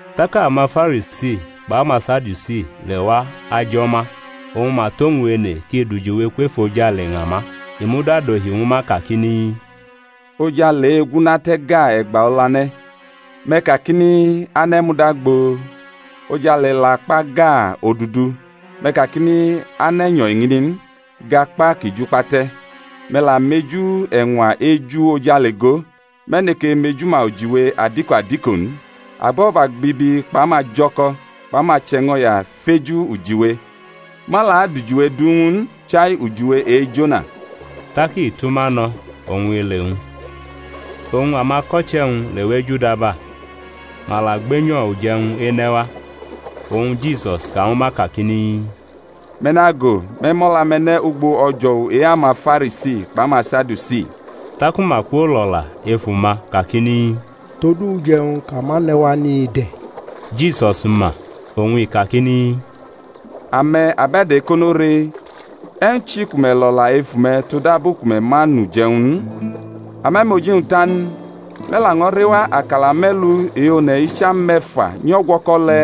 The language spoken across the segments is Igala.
Tak amaFarisi kpʼamaSadiusi lewa ajʼo̩ ma, oñ ma tʼowñ ene kʼi dʼujiwe kwʼefojale ña ma. I muda dohi ñwu ma kakini, Ojale gu una te̩ gaa e̩gba olane̩, me̩ kakini, Ane̩ muda gboo; ojale la kpa gaa odudu, me̩ kakini, Ane̩ nyo̩ eñini n, gʼakpa ki jukpa te̩. Me̩ la meju eñwa eju ojale go, me̩ neke mejuma ujiwe adiko adiko n? Abo̩gba bibi kpʼamajo̩ko̩ kpʼamache̩ño̩ya feju ujiwe; ma la adʼujiwe du ñw u n, chai ujiwe e-Jona. Tak i tʼuma no̩ oñ i le e-wñ. Oñ amako̩che̩-wñ lewʼej udaba, ma la gbenyo̩ uje̩wñ ene̩ wa. Oñ Jisus ka ñwu ma kakini, Me̩ nago, me̩ mʼo̩la-me̩ ne̩ ugbo o̩jo̩wu e-amaFarisi kpʼamaSadiusi. Taku ma kwolʼo̩la ef uma kakini, Tod uje̩wñ kʼa ma ne̩ wa ni de̩. Jisus ma, oñ i kakini, Ame̩ abe̩do̩ ekono re, e̩wñ chi ku me̩ lʼo̩la ef ume̩ todabu ku me̩ ma nʼuje̩-wñ n? Ame̩ mʼoji-wñ ta n, me̩ laño̩ rewa akala me̩lu e-one̩ icham me̩fa nyʼo̩gwo̩ko̩ le̩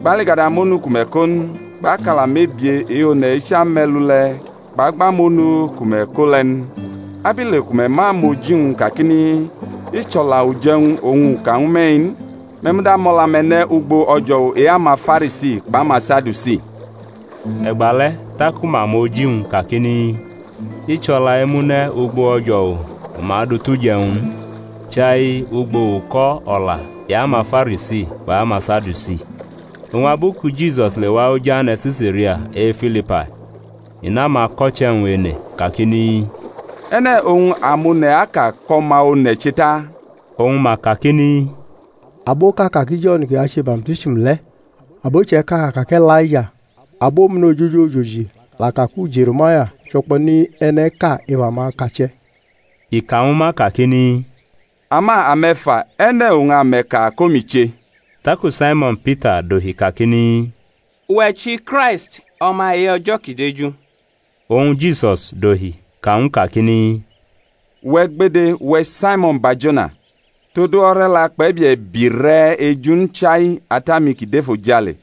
kpʼaligada monu ku me̩ ko n? Kpʼakala mebie e-one̩ icham me̩lu le̩, kpʼagba monu ku me̩ ko le̩ n? Abile ku me̩ ma mʼoji-wñ n kakini, I chʼo̩la uje̩wñ oñ u ka ñwu me̩-i n? Me̩ muda mʼo̩la-me̩ ne̩ ugbo o̩jo̩wu e-amaFarisi kpʼamaSadiusi. E̩gbale̩ taku ma mʼoji-wñ kakini, I chʼo̩la emune̩ ugbo o̩jo̩wu ku ma du tʼuje̩wñ n, chai ugbo uko̩ o̩la e-amaFarisi kpʼamaSadiusi. Oñ abu ku Jisus lewa oj ane̩ Se̩saria e-Filipai, i nʼamako̩che̩-wñ ene kakini, E̩ne̩ oñ amone̩ aka kʼO̩ma One̩ che ta? Oñ ma kakini, Aboʼka aka ki Jo̩n kʼi ache baptism le̩; abo iche̩ka ka kʼE̩laija; abomune̩ ojoji ojoji la ka ku Je̩re̩maya, cho̩kpo̩ni e̩ne̩ʼka ef amakache̩. I ka ñwu ma kakini, Ama ame̩ fa. E̩ne̩ oñ ame̩ ka kʼomi che? Taku Saimo̩n Pita dohi kakini, Uwe̩ chʼiKraisti, O̩ma e-O̩jo̩ kʼi deju. Oñ Jisus dohi ka ñw u kakini, Uwe̩ gbede, uwe̩ Saimo̩n Barjona, todu o̩re̩la kpʼe̩bie̩ biʼi rʼe̩ eju n, chai Ata-mi kʼi dʼefojale.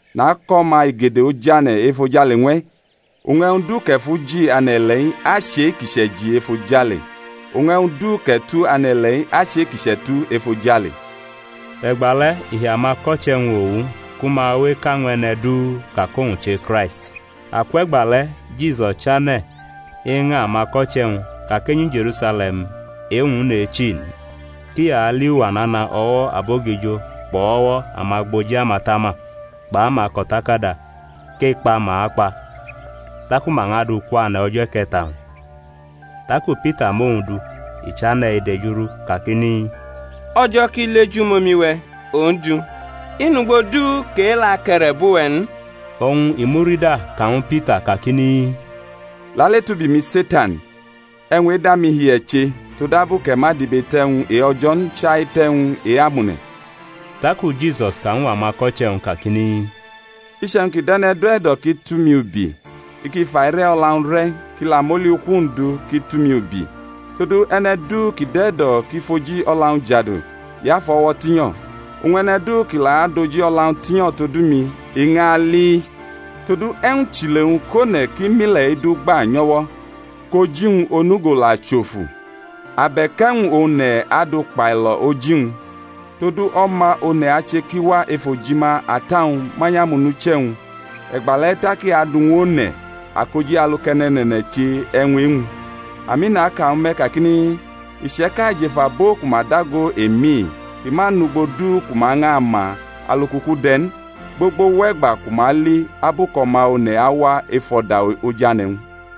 Nakʼo̩ma igede ojane̩ efojale ñw e̩; oñ e̩wñ duu kʼe̩ fʼu ji ane̩-ile̩-i achʼe-kʼi chʼe̩ji efojale. Oñ e̩wñ du kʼe̩ tu ane̩-ile̩-i achʼe-kʼi chʼe̩tu efojale. E̩gbale̩ i hi amako̩che̩-wñ owu ku ma we eka ñw e̩ne̩ du ka kʼowñ che Kraisti. Akwʼe̩gbale̩ Jisus chane̩ eña amako̩che̩-wñ ka kʼenyi Je̩rusale̩m e-wñ nʼechi n, kʼi ali uwa nana o̩wo̩ abogijo kpʼo̩wo̩ amagboji amatama kpʼamako̩takada, kʼekpa ma akpa, taku ma ñʼadʼu kwane̩ o̩jo̩ e̩ke̩ta-wñ. Taku Pita mʼowñ du, i chane̩ edejurʼu kakini, O̩jo̩ ki li ejumomi-we̩, Ondu; i nʼugbo du kʼe-le̩ ake̩re̩bʼuwe̩ n. Oñ i murida ka ñwu Pita kakini, Lale tʼubi-mi, Setan: e̩wñ e̩da mi hi e̩ che, todabu kʼe̩ ma dʼibe tʼe̩wñ e-O̩jo̩ n, chai tʼe̩wñ e-amone̩. Taku Jisus ka ñw amako̩che̩-wñ kakini, Iche̩wñ ki dʼe̩ne̩ du e̩do̩ kʼi tʼumi ubi, i ki fʼaire̩ o̩la-wñ re̩, kʼi la mʼoli uku-wñ du, kʼi tʼumi ubi. Todu e̩ne̩ du ki dʼe̩ e̩do̩ kʼi fʼoji o̩la-wñ jadu, i afʼu o̩wo̩ tinyo̩; oñ e̩ne̩ du kʼi la adʼoji o̩la-wñ tinyo̩ todu mi, i ñʼaliʼi. Todu e̩wñ chʼile-wñ kʼone̩ ki mʼile̩-i du gba nyʼo̩wo̩, kʼoji-wñ onugo la chʼofu? Abe̩k e̩wñ oñ one̩ adʼu kpailo̩ oji-wñ? Todu O̩ma One̩ ache kʼi wa ef ojima Ata-wñ manyʼamonuche̩-wñ, e̩gbale̩ tak i adu ñw one̩ akoji alu kʼe̩ne̩ne̩ne̩ne̩ che e̩wñ e-wñ. Ami, naka ñwu me̩ kakini, Iche̩ka jʼef abo ku ma dago emi-i ki ma nʼugbo du ku ma ñʼama alu kʼuku de̩ n, gbogbo wʼe̩gba ku ma li abu kʼO̩ma One̩ awa ef o̩da ojane̩-wñ.